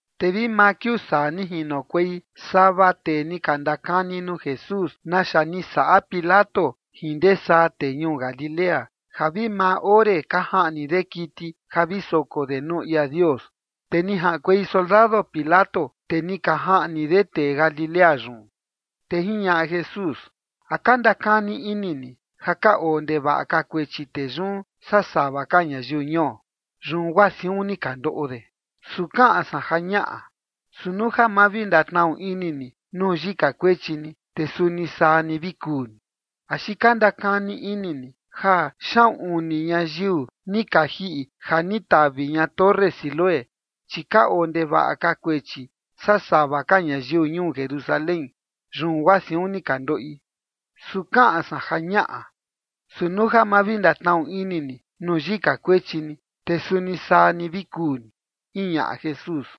Te vi maa kiuu saa ni jinokuei sava tee ni ka ndakani nuu Jesús naxa ni saꞌa Pilato jin ndee saa tee ñuu Galilea, ja vi maa ore ka jaꞌni de kiti ja vi soko de nuu ia Dios, te ni jaꞌankuei soldado Pilato, te ni ka jaꞌni de tee Galilea yun. Te jiñaꞌa Jesús: ―¿A ka ndakani ini ni ja ka oo ndevaꞌa ka kuechi tee yun saa sava ka ñayiu ñuo, yun guaa siun ni ka ndoꞌo de? Su kaꞌan san ja ñaꞌa. Su nuu ja ma vi ndatnaꞌu ini ni nuu yika kuechi ni, te suni saa ni vi kuu ni. ¿Axi ka ndakani ini ni ja xaꞌun uni ñayiu ni ka jiꞌi ja ni tavi ña torre Siloé, chi ka oo ndevaꞌa ka kuechi saa sava ka ñayiu ñuu Jerusalén, yun guaa siun ni ka ndoꞌi? Su kaꞌan san ja ñaꞌa. Su nuu ja ma vi ndatnaꞌu ini ni nuu yika kuechi ni, te suni saa ni vi kuu ni ―jiñaꞌa Jesús.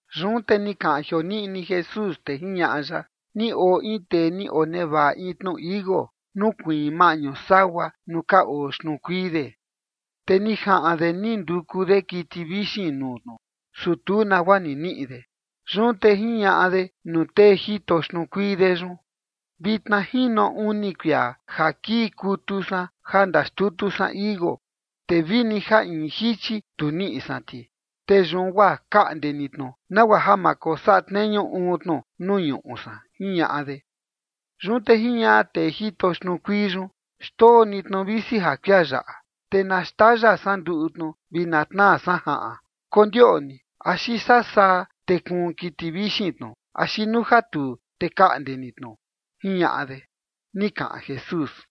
Yun te ni kaꞌan jioniꞌni Jesús, te jiñaꞌa ya: ―Ni oo in tee ni onevaꞌa in tnu tichi iuu, nukuiin maꞌñu sagua nuu ka oo xtnuu kuii de. Te ni jaꞌan de ni nduku de kiti vixin nuu tnu, su tu nagua ni niꞌi de. Yun te jiñaꞌa de nuu tee jito xtnuu kuii de yun: “Vitna jino uni kuia ja kii kutu san ja ndaxtutu san tichi iuu, te vini ja in jichi tu niꞌi san ti. Te yun guaa kaꞌnde ni tnu, nagua ja ma kosaꞌa tneñu uun tnu nuu ñuꞌu san”, jiñaꞌa de. Yun te jiñaꞌa tee jito xtnuu kuii yun: “Xndoo ni tnu, visi ja kuia yaꞌa, te na xtaya san nduꞌu tnu vi na tnaa san jaꞌan. Kondioꞌni axi sasaa te kuun kiti vixin tnu, axi nuu ja tuu, te kaꞌnde ni tnu”, jiñaꞌa de ―ni kaꞌan Jesús.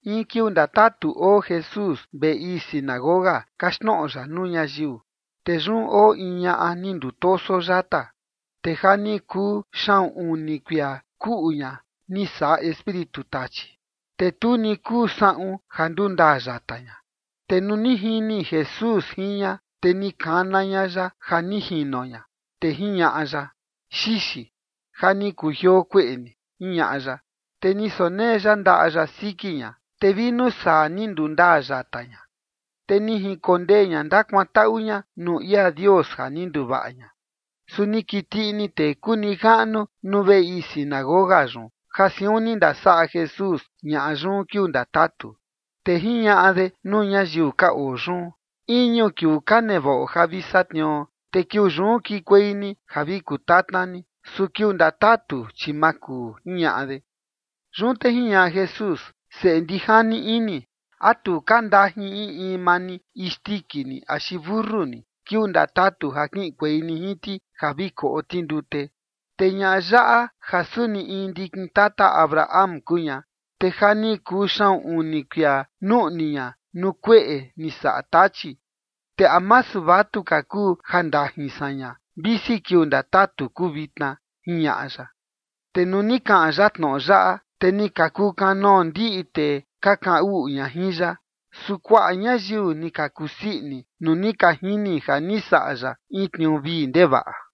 In kiuu ndatatu oo Jesús veꞌe ii sinagoga, kaxtnoꞌo ya nuu ñayiu. Te yun oo in ñaꞌa ni ndutoso yata, te ja ni kuu xaꞌun uni kuia kuꞌu ña ni saꞌa espíritu tachi, te tu ni kuu saꞌun ja ndundaa yata ña. Te nuu ni jini Jesús jin ña, te ni kana ña ya ja ni jino ña, te jiñaꞌa ya: ―Xixi, ja ni kujioo kueꞌe ni ―jiñaꞌa ya. Te ni sonee ya ndaꞌa ya siki ña. Te vi nuu saa ni ndundaa yata ña, te ni jinkondee ña ndakuantaꞌu ña nuu ia Dios ja ni nduvaꞌa ña. Su ni kiti ini tee kuu nijaꞌnu nuu veꞌe ii sinagoga yun ja siun ni ndasaꞌa Jesús ñaꞌa yun kiuu ndatatu, te jiñaꞌa de nuu ñayiu ka oo yun: ―Iñu kiuu ka nevaꞌo ja vi satniuo, te kiuu yun kikuei ni ja vi kutatna ni. Su kiuu ndatatu, chi ma kuu ―jiñaꞌa de. Yun te jiñaꞌa Jesús: ―¡Seꞌe ndijani ini! ¿A tu ka ndajin in in maa ni isndiki ni axi mentu ni kiuu ndatatu ja kiꞌinkuei ni jin ti ja vi koꞌo ti ndute? Te ñaꞌa yaꞌa ja suni in ndikin tata Abraham kuu ña, te ja ni kuu xaꞌun uni kuia nuꞌni ña nuu kueꞌe ni saꞌa Tachi. Te ¿a masu vatuka kuu ja ndajin san ña, visi kiuu ndatatu kuu vitna? ―jiñaꞌa ya. Te nuu ni kaꞌan ya tnoꞌo yaꞌa, te ni ka kukanoo ndiꞌi tee ka kaꞌan uꞌu ña jin ya. Su kuaꞌa ñayiu ni ka kusii ini nuu ni ka jini ja ni saꞌa ya in tniuu vii ndevaꞌa.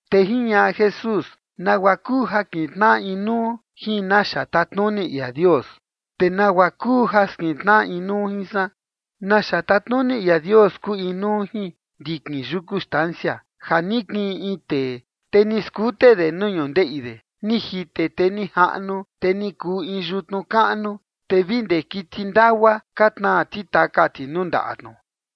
Te jiñaꞌa Jesús: ―¿Nagua kuu ja kintnaꞌa inuu jin naxa tatnuni ia Dios, te nagua kuu ja skintnaꞌa inuu jin san? Naxa tatnuni ia Dios kuu inuu jin ndikin yuku stancia, ja ni kiꞌin in tee, te ni skute de nuu ñundeꞌi de. Ni jite te ni jaꞌnu, te ni kuu in yutnu kaꞌnu, te vi ndee kiti ndagua ka tnaa ti taka ti nuu ndaꞌa tnu.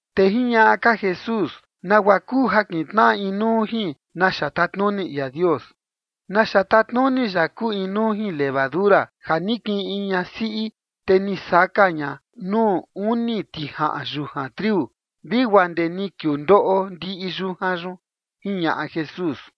Te jiñaꞌa ka Jesús: ―¿Nagua kuu ja kintnaꞌa inuu jin naxa tatnuni ia Dios? Naxa tatnuni ya kuu inuu jin levadura, ja ni kiꞌin in ñasiꞌi, te ni saka ña nuu uni tijaꞌan yujan triu, vi guaa ndee ni kiuu ndoꞌo ndiꞌi yujan yun ―jiñaꞌa Jesús.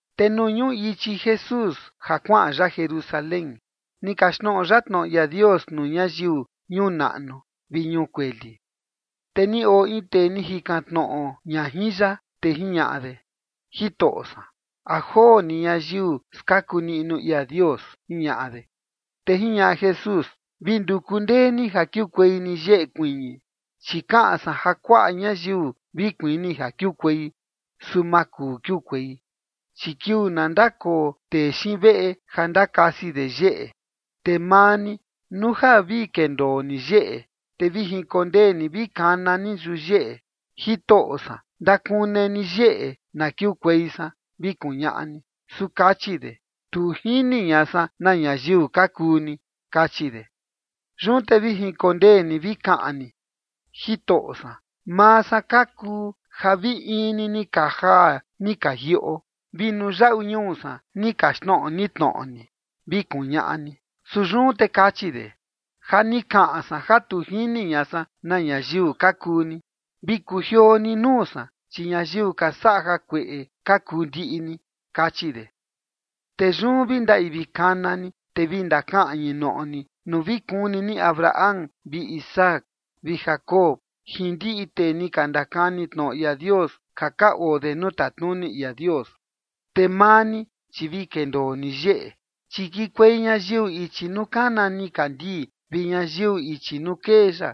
Te nuu ñuꞌu ichi Jesús ja kuaꞌan ya Jerusalén, ni kaxtnoꞌo ya tnoꞌo ia Dios nuu ñayiu ñuu naꞌnu vi ñuu kueli. Te ni oo in tee ni jikan tnoꞌo ña jin ya, te jiñaꞌa de: ―Jitoꞌo san, ¿a joo ni ñayiu skaku niꞌnu ia Dios? ―jiñaꞌa de. Te jiñaꞌa Jesús: ―Vi nduku ndee ni ja kiukuei ni yeꞌe kuiñi, chi kaꞌan san ja kuaꞌa ñayiu vi kuini ja kiukuei, su ma kuu kiukuei. Chi kiuu na ndakoo tee xiin veꞌe ja ndakasi de yeꞌe, te maa ni, nuu ja vi kendoo ni yeꞌe, te vi jinkondee ni vi kana ni yuyeꞌe: “Jitoꞌo san, ndakune ni yeꞌe, na kiukuei san”, vi kuñaꞌa ni. Su kachi de: “Tu jini ña san na ñayiu ka kuu ni”, kachi de. Yun te vi jinkondee ni vi kaꞌan ni: “Jitoꞌo san, maa san ka kuu ja vi in ni ni ka jaa ni ka jiꞌo, vi nuu yaꞌu ñuu san ni kaxtnoꞌo ni tnoꞌo ni”, vi kuñaꞌa ni. Su yun te kachi de: “Ja ni kaꞌan san ja tu jini ña san na ñayiu ka kuu ni. Vi kujioo ni nuu san, chi ñayiu ka saꞌa jakueꞌe ka kuu ndiꞌi ni”, kachi de. Te yun vi ndaꞌi vi kana ni, te vi ndakaꞌñi noꞌo ni nuu vi kuni ni Abraham vi Isaac vi Jacob jin ndiꞌi tee ni ka ndakani tnoꞌo ia Dios, ja ka oo de nuu tatnuni ia Dios. Te maa ni, chi vi kendoo ni yeꞌe. Chi kikuei ñayiu ichi nuu kana nikandii, vi ñayiu ichi nuu kee ya,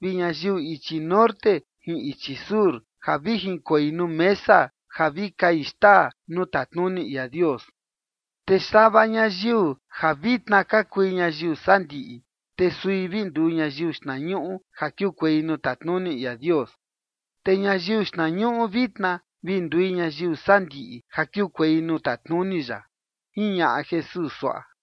vi ñayiu ichi norte jin ichi sur ja vi jinkoi nuu mesa ja vi kai xtaa nuu tatnuni ia Dios. Te sava ñayiu ja vitna ka kui ñayiu sandiꞌi, te sui vi nduu ñayiu xtnañuꞌu ja kiukuei nuu tatnuni ia Dios. Te ñayiu xtnañuꞌu vitna, vi ndui ñayiu sandiꞌi ja kiukuei nuu tatnuni ya ―jiñaꞌa Jesús suaꞌa.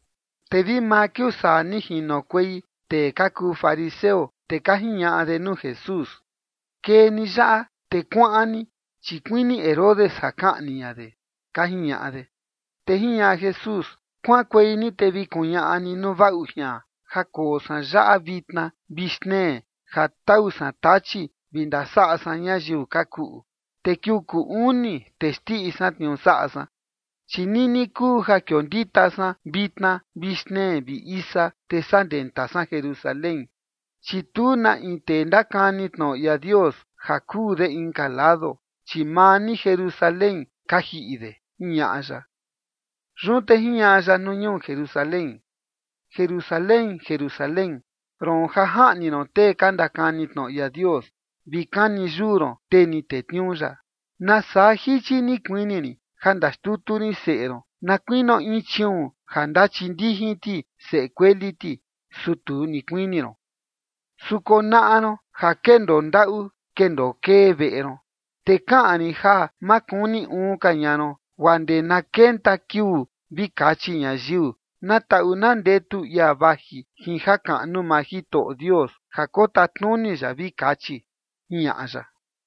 Te vi maa kiuu saa, ni jinokuei tee ka kuu fariseo, te ka jiñaꞌa de nuu Jesús: ―Kee ni yaꞌa, te kuaꞌan ni, chi kuini Herodes ja kaꞌni ña de ―ka jiñaꞌa de. Te jiñaꞌa Jesús: ―Kuaꞌankuei ni te vi kuñaꞌa ni nuu vaꞌu jian ja koo san yaꞌa vitna vi xtnee ja tau san tachi vi ndasaꞌa san ñayiu ka kuꞌu, te kiuu kuu uni te xndiꞌi san tniuu saꞌa san. Chi nini kuu ja kiondita san vitna vi xtnee vi isa, te saa ndenta san Jerusalén, chi tu na in tee ndakani tnoꞌo ia Dios ja kuu de inka lado, chi maa ni Jerusalén ka jiꞌi de ―jiñaꞌa ya. Yun te jiñaꞌa ya nuu ñuu Jerusalén: ―Jerusalén, Jerusalén, roon ja jaꞌni ron tee ka ndakani tnoꞌo ia Dios, vi kani yuu ron tee ni tetniuu ya, ¡nasaa jichi ni kuini rin ja ndaxtutu rin seꞌe ron na kuinio in chiuun ja ndachindijin ti seꞌe kueli ti, su tu ni kuini ron! Su konaꞌa ron ja kendoo ndaꞌu kendoo kee veꞌe ron. Te kaꞌan rin ja ma kuni uun ka ña ron guaa ndee na kenta kiuu vi kachi ñayiu: “Na taꞌu na ndetu ia vaji jin jakaꞌnu maa Jitoꞌo Dios ja kotatnuni ya”, vi kachi ―jiñaꞌa ya.